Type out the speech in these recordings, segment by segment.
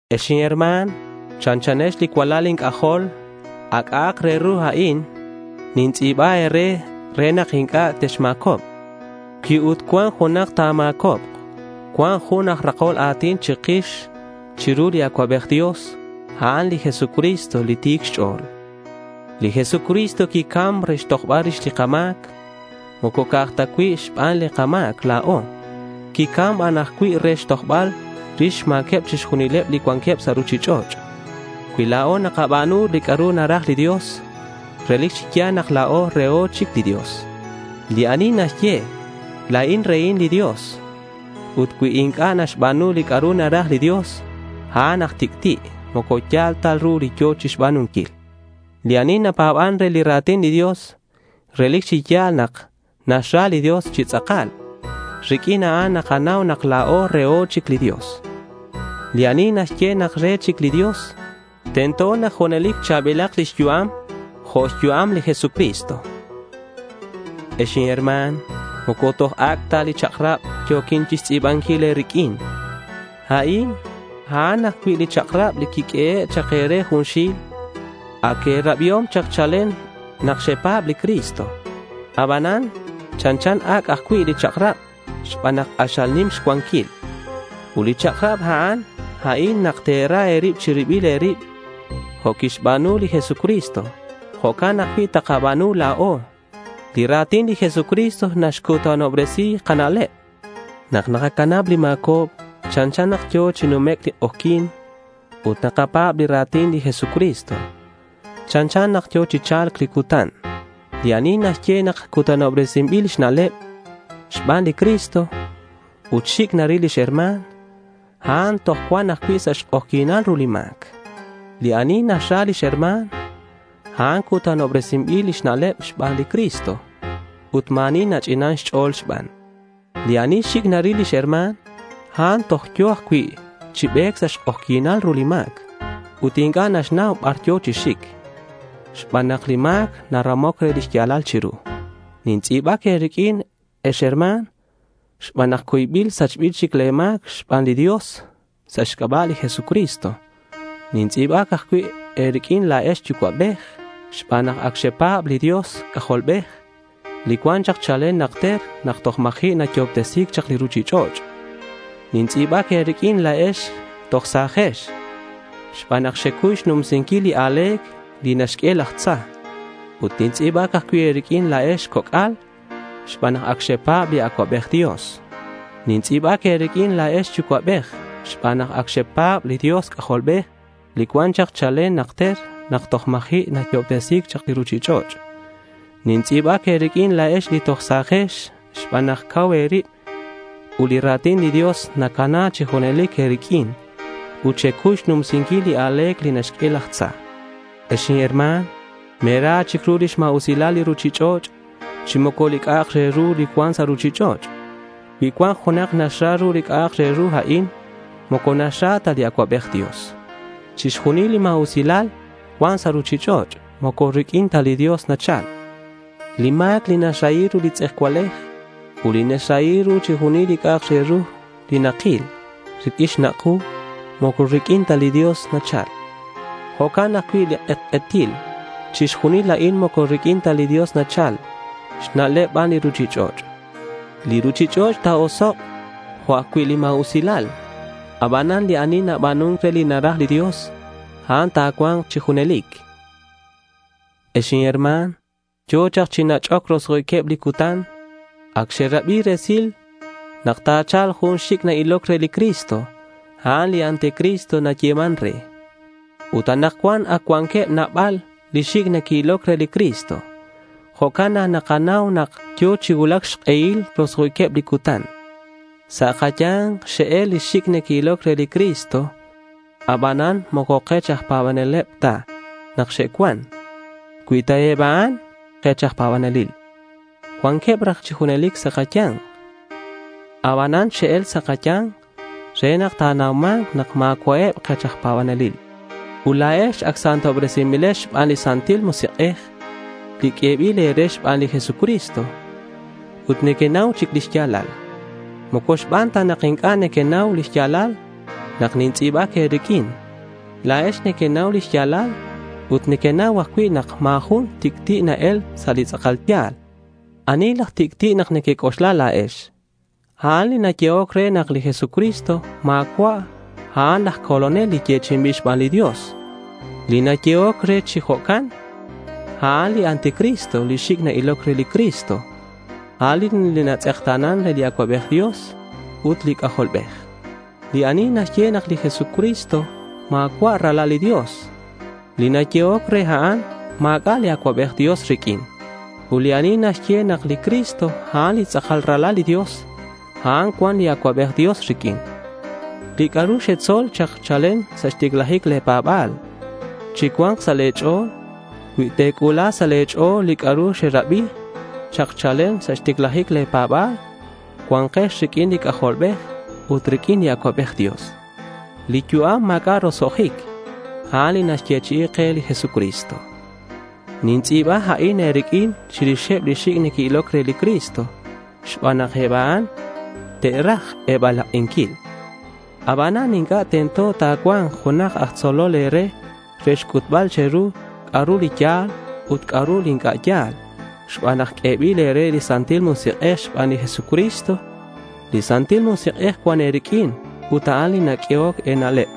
Ex inherma̱n, chanchanex li cualal inc'ajol. A' c'a'ak re ru a'in nintz'i̱ba e̱re re nak inc'a' texma̱cobk. Cui ut cuan junak ta̱ma̱cobk, cuan jun aj jalol a̱tin chikix chiru li Acuabej Dios, a'an li Jesucristo li ti̱c xch'o̱l. Li Jesucristo quicam re xtojbal rix li kama̱c. Moco ca'aj ta cui' xban li kama̱c la̱o. Quicam aj ban cui' re xtojbal rix xma̱queb chixjunileb li cuanqueb sa' ruchich'och'. Cui la̱o nakaba̱nu li c'a'ru naraj li Dios, relic chi ya̱l nak la̱o reho chic li Dios. Li ani naxye, “La̱in rehin li Dios”, ut cui inc'a' naxba̱nu li c'a'ru naraj li Dios, a'an aj tic'ti'. Moco ya̱l ta ru li yo̱ chixba̱nunquil. Li ani napa̱ban re li ra̱tin li Dios, relic chi ya̱l nak naxra li Dios chi tz'akal. Riq'uin a'an nakanau nak la̱o reho chic li Dios. Li ani naxye nak re chic li Dios, tento nak junelic cha̱bilak lix yu'am jo' xyu'am li Jesucristo. Ex inherma̱n, moco toj ac' ta li chak'rab yo̱quin chixtz'i̱banquil e̱riq'uin. A'in a'an ajcui' li chak'rab li quiq'uehe' chak e̱re junxil. Ac e̱rabiom chak chalen nak xepa̱b li Cristo. Abanan chanchan ac' ajcui' li chak'rab xban nak k'axal nim xcuanquil. Ut li chak'rab a'an, a'in nak te̱ra e̱rib che̱ribil e̱rib. Jo' quixba̱nu li Jesucristo, jo'can ajcui' takaba̱nu la̱o. Li ra̱tin li Jesucristo naxcutanobresi kana'leb. Nak nakacanab li ma̱cobc, chanchan nak yo̱ chi numec' li k'ojyi̱n. Ut nak nakapa̱b li ra̱tin li Jesucristo, chanchan nak yo̱ chi cha̱lc li cutan. Li ani naxye nak xcutanobresi̱c lix na'leb xban li Cristo, ut xic' naril lix herma̱n a'an toj cuan ajcui' sa' xk'ojyi̱nal ru li ma̱c. Li ani naxra lix herma̱n, a'an cutanobresinbil lix na'leb xban li Cristo. Ut ma̱ ani nach'inan xch'o̱l xban. Li ani xic' naril lix herma̱n, a'an toj yo̱ ajcui' chi be̱c sa' xk'ojyi̱nal ru li ma̱c. Ut inc'a' naxnau bar yo̱ chi xic xban nak li ma̱c naramoc re li xya̱lal chiru. Nintz'i̱bac e̱riq'uin, ex herma̱n, xban nak cuybil sachbil chic le̱ ma̱c xban li Dios sa' xc'aba' li Jesucristo. Nintz'i̱bac ajcui' e̱riq'uin, la̱ex yucua'bej, xban nak ac xepa̱b li Dios C'ajolbej li cuan chalen chak najter nak toj ma̱ji' naxyo'obtesi chak li ruchich'och'. Nintz'i̱bac e̱riq'uin la̱ex li toj sa̱jex xban nak xecuy xnumsinquil li a̱le̱c li naxq'ue laj tza. Ut nintz'i̱bac ajcui' e̱riq'uin la̱ex coc'al xban nak ac xepa̱b li Acuabej Dios. Xintz'i̱bac e̱riq'uin la̱ex yucua'bej, xban nak ac xepa̱b li Dios C'ajolbej li cuan chalen chak najter nak toj ma̱ji' naxyo'obtesi chak li ruchich'och'. Xintz'i̱bac e̱riq'uin la̱ex li toj sa̱jex, xban nak cau e̱rib ut li ra̱tin li Dios nacana chi junelic e̱riq'uin ut xecuy xnumsinquil li a̱le̱c li naxq'ue laj tza. Ex inherma̱n, me̱ra chic ru lix ma̱usilal li ruchich'och' chi moco li c'a'ak re ru cuan sa' ruchich'och'. Cui cuan junak naxra ru li c'a'ak re ru a'in, moco naxra ta li Acuabej Dios. Chixjunil li ma̱usilal cuan sa' ruchich'och' moco riq'uin ta li Dios nachal. Li ma̱c li naxrahi ru li tz'ejcualej ut li xrahinquil ru li c'a'ak re ru nakil riq'uin xnak' ku moco riq'uin ta li Dios nachal. Jo'can ajcui' li k'etk'etil. Chixjunil a'in moco riq'uin ta li Dios nachal; xna'leb ban li ruchich'och'. Li ruchich'och' ta̱osok' jo' ajcui' li ma̱usilal. Abanan li ani naba̱nun re li naraj li Dios, a'an cua̱nk chi junelic. Ex inherma̱n, yo̱ chak chi nach'oc roso'jiqueb li cutan. Ac xerabi resil nak ta̱cha̱lk jun li xic' na-iloc re li Cristo. A'an li anticristo nayeman re. Ut anakcuan ac cuanqueb nabal li xic' neque'iloc re li Cristo. Jo'can nak nakanau nak yo̱ chi cuulac xk'ehil roso'jiqueb li cutan. Sa' kaya̱nk xe'el li xic' neque'iloc re li Cristo, abanan moco kech aj pa̱baneleb ta nak xe'cuan. Cui ta eb a'an kech aj pa̱banelil, cuanqueb raj chi junelic sa' kaya̱nk. Abanan xe'el sa' kaya̱nk re nak ta̱nauma̱nk nak ma̱cua'eb kech aj pa̱banelil. Ut la̱ex ac santobresinbilex xban li Santil Musik'ej li q'uebil e̱re xban li Jesucristo, ut nequenau chic li xya̱lal. Moco xban ta nak inc'a' nequenau li xya̱lal nak nintz'i̱bac e̱riq'uin. La̱ex nequenau li xya̱lal ut nequenau ajcui' nak ma̱ jun tic'ti' na-el sa' li tz'akal ya̱l. ¿Ani laj tic'ti' nak nequec'oxla la̱ex? A'an li nayehoc re nak li Jesucristo, ma̱cua' a'an laj Colonel li yechi'inbil xban li Dios. Li nayehoc re chi jo'can, a'an li anticristo li xic' na-iloc re li Cristo. A'an li natz'ekta̱nan re li Acuabej Dios ut li C'ajolbej. Li ani naxye nak li Jesucristo ma̱cua' Ralal li Dios, li nayehoc re a'an ma̱c'a' li Acuabej Dios riq'uin. Ut li ani naxye nak li Cristo, a'an li tz'akal Ralal li Dios, a'an cuan li Acuabej Dios riq'uin. Li c'a'ru xetzol chak chalen sa' xticlajic le̱ pa̱ba̱l chicua̱nk sa' le̱ ch'o̱l. Cui te̱c'u̱la sa' le̱ ch'o̱l li c'a'ru xerabi chak chalen sa' xticlajic le̱ pa̱ba̱l, cua̱nkex riq'uin li C'ajolbej ut riq'uin li Acuabej Dios. Li yu'am ma̱c'a' roso'jic, a'an li naxyechi'i ke li Jesucristo. Nintz'i̱ba a'in e̱riq'uin chirixeb li xic' neque'iloc re li Cristo xban nak eb a'an te'raj e̱balak'inquil. Abanan inc'a' tento ta̱cua̱nk junak aj tzolol e̱re re xc'utbal che̱ru c'a'ru li ya̱l ut c'a'ru li inc'a' ya̱l xban nak q'uebil e̱re li Santil Musik'ej xban li Jesucristo. Li Santil Musik'ej cuan e̱riq'uin ut a'an li naq'uehoc e̱na'leb.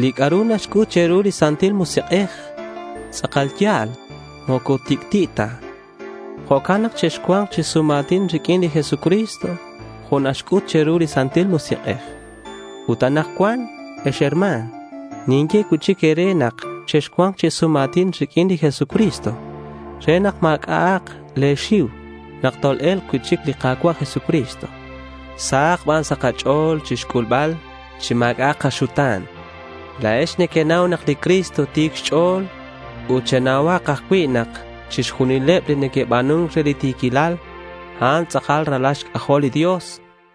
Li c'a'ru naxc'ut che̱ru li Santil Musik'ej tz'akal ya̱l. Moco tic'ti' ta. Jo'can nak chexcua̱nk chi sum a̱tin riq'uin li Jesucristo jo' naxc'ut che̱ru li Santil Musik'ej. Ut anakcuan, ex herma̱n, ninye cui'chic e̱re nak chexcua̱nk chi sum a̱tin riq'uin li Jesucristo re nak ma̱c'a'ak le̱ xiu nak tol-e̱lk cui'chic li Ka̱cua' Jesucristo. Sahak ban sa' kach'o̱l chixc'ulbal chi ma̱c'a'ak kaxuta̱n. La̱ex nequenau nak li Cristo ti̱c xch'o̱l. Ut chenauhak ajcui' nak chixjunileb li neque'ba̱nun re li ti̱quilal, a'an tz'akal ralal xc'ajol li Dios.